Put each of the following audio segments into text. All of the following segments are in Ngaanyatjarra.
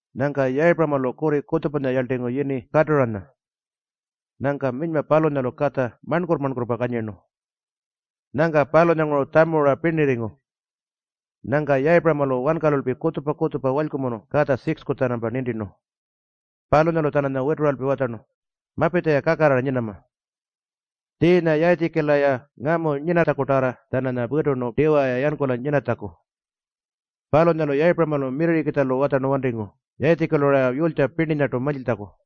Nyangka Yayipuramalu kurri kutjupanya yarltingu yini Katuranya. Nyangka minyma palunyalu katja marnkurrpa-marnkurrpa kanyirnu. Nyangka palunyanguru tjamu-ra pirnirringu. Nyangka Yayipuramalu wankalulpi kutjupa-kutjupa walykumunu katja 6-ku-tjanampa nintirnu. Palunyalu-tjananya wituralpi watjarnu, “Mapitja-ya kakarrara nyinama.” Tjiinya Yayitjikila-ya ngamu nyinatjakutarra-tjananya witurnu tiwa-ya yankula nyinatjaku. Palunyalu Yayipuramalu mirrirrikitjalu watjarnu wantingu Yayitjikilu-ra yulytja pirninyartu mantjiltjaku.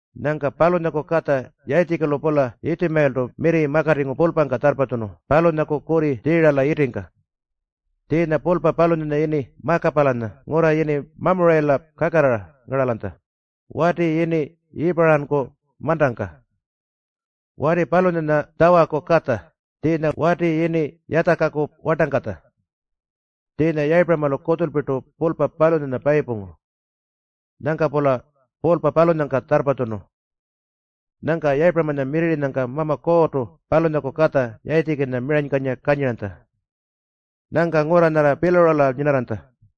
Nyangka palunyaku katja Yayitjikilu-pula Yitjumayiltu mirri makatingu pulpangka tjarrpatjunu palunyaku kurri Tjiirala yitingka. Tjiinya pulpa palunyanya yini Makapalanya ngurra yini Mamurayila kakarrara ngaralanytja, wati yini Yiipuranku mantangka. Wati palunyanya Tjawaku katja, tjiinya wati yini Yatjaku wartangkatja. Tjiinya Yayipuramalu kutjulpirtu pulpa palunyanya payipungu. Nyangka-pula pulpa palunyangka tjarrpatjunu. Nyangka Yayipuramanya mirrirrinyangka Mama Kuurrtu palunyaku katja Yayitjikinya miranykanyira kanyiranytja. Nyangka ngurra nyarra Piilarula nyinarranytja.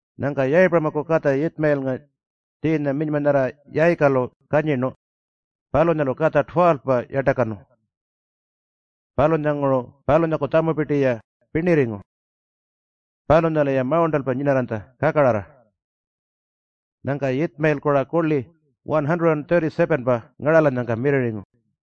Nyangka Yayipuramaku katja Yitjumayilnga, tjiinya minyma nyarra Yayikalu kanyirnu, palunyalu katja 12-pa yartakanu. Palunyanguru palunyaku tjamupirti-ya pirnirringu. Palunyalu-ya mawurntalpa nyinarranytja kakarrara. Nyangka Yitjumayilku-ra kurli 137-pa ngaralanyangka mirrirringu.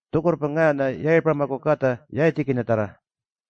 Tjukurrpa ngaanya Yayipuramaku katja Yayitjikinyatjarra.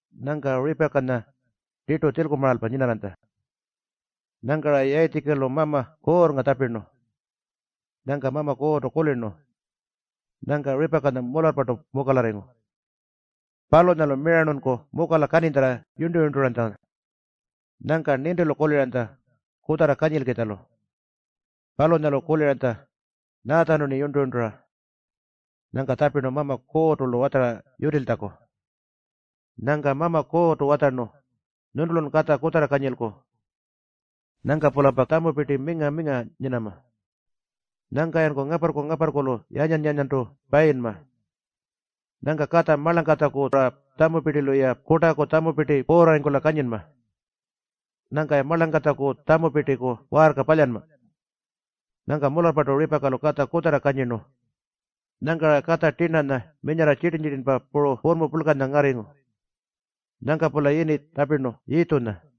Nyangka Ripakanya tirtu tjilkumaralpa nyinarranytja. Nyangka-ra Yayitjikilu Mama Kuurrnga tjapirnu. Nyangka Mama Kuurrtu kulirnu. Nyangka Ripakanya mularrpartu mukalarringu. Palunyalu mirarnunku mukala kaninytjarra yurntu-yurnturanytja. Nyangka nintilu kuliranytja kutjarra kanyilkitjalu. Palunyalu kuliranytja, “Nyaatjanu-rni yurntu-yurntura?” Nyangka tjapirnu Mama Kuurrtu-lu watjara yutiltjaku. Nyangka Mama Kuurrtu watjarnu, “Nyuntulun katja kutjarra kanyilku. Nyangka-pulampa tjamupirti minga-minga nyinama. Nyangka-yanku ngaparrku-ngaparrkulu yanyan-yanyantu payinma. Nyangka katja marlangkatjaku-ra tjamupirtilu-ya kurtaku tjamupirti puurrarringkula kanyinma. Nyangka-ya marlangkatjaku tjamupirtiku waarka palyanma.” Nyangka mularrpartu Ripakalu katja kutjarra kanyirnu. Nyangka-ra katja tirnanya minyarra tjitirn-tjitirnpa puru purrmu purlkanya ngarringu. Nyangka-pula yini tjapirnu Yiitjunya.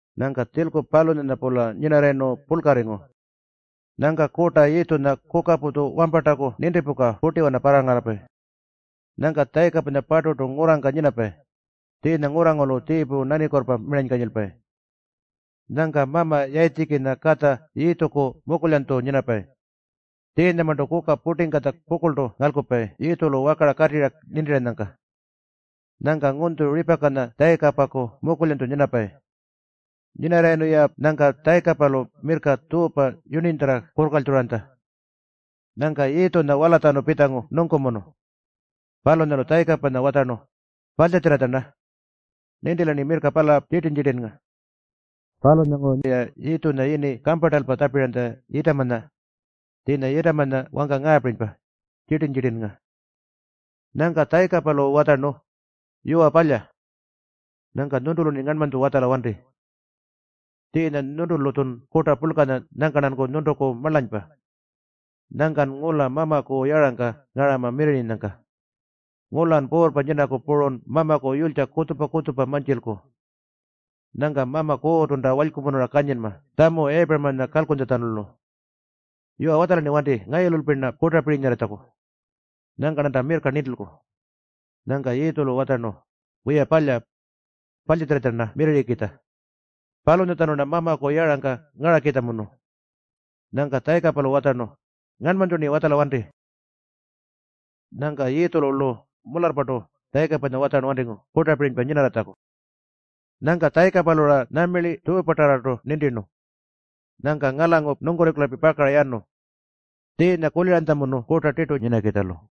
Nyangka tjilku palunyanya-pula nyinarrayirnu purlkarringu. Nyangka kurta Yiitjunya kukaputju wampartaku nintipuka purtiwana parrangarapayi. Nyangka Tjayikapanya-parturtu ngurrangka nyinapayi, tjiinya ngurrangurulu tjiipu nanikuurrpa miranykanyilpayi. Nyangka mama Yayitjikinya katja Yiitjuku mukulyanytju nyinapayi. Tjiinyamarntu kuka purtingkatja pukurltu ngalkupayi Yiitjulu wakara katirra nintiranyangka. Nyangka ngunytju Ripakanya Tjayikapaku mukulyanytju nyinapayi. Nyinarrayirnu-ya nyangka Tjayikapalu mirrka tjuupa yurninytjarra kurrkaltjuranytja. Nyangka Yiitjunya walatjanu pitjangu nungkumunu. Palunyalu Tjayikapanya watjarnu, “Parltjatjirratja-rna. Nintila-rni mirrka pala tjitirn-tjitirnnga.” Palunyalanguru-ya Yiitjunya yini kamparntalpa tjapiranytja Yiitamanya. Tjiinya Yiitamanya wangka ngaapirinypa, Tjitirn-tjitirnnga. Nyangka Tjayikapalu watjarnu, “Yuwa palya. Nyangka nyuntulu-rni ngarnmanytju watjala wanti. Tjiinya nyuntulu-tjun kurta purlkanya nyangka-rnanku nyuntuku marlanypa. Nyangkan ngula Mamaku yarangka ngarama mirrirrinyangka. Ngulan puurrpa nyinaku purun Mamaku yulytja kutjupa-kutjupa mantjilku. Nyangka Mama Kuurrtunta walykumunura kanyinma tjamu Yayipuramanya kalkuntjatjanulu. Yuwa, watjala-rni wanti ngayululpi-rna kurtapirinyarritjaku. Nyangka-rnanta mirrka nintilku.” Nyangka Yiitjulu watjarnu, “Wiya palya. Parltjatjirratja-rna mirrirrikitja. Palunyatjanu-rna Mamaku yarangka ngarakitjamunu.” Nyangka Tjayikapalu watjarnu, “Ngarnmanytju-rni watjala wanti.” Nyangka Yiitjulu-lu mularrpartu Tjayikapanya watjarnu wantingu kurtapirinypa nyinarratjaku. Nyangka Tjayikapalu-ra nyuma tjuupatarrartu nintirnu. Nyangka ngalangu nungkurringkulalpi pakara yanu. Tjiinya kuliranytjamunu kurta tirtu nyinakitjalu.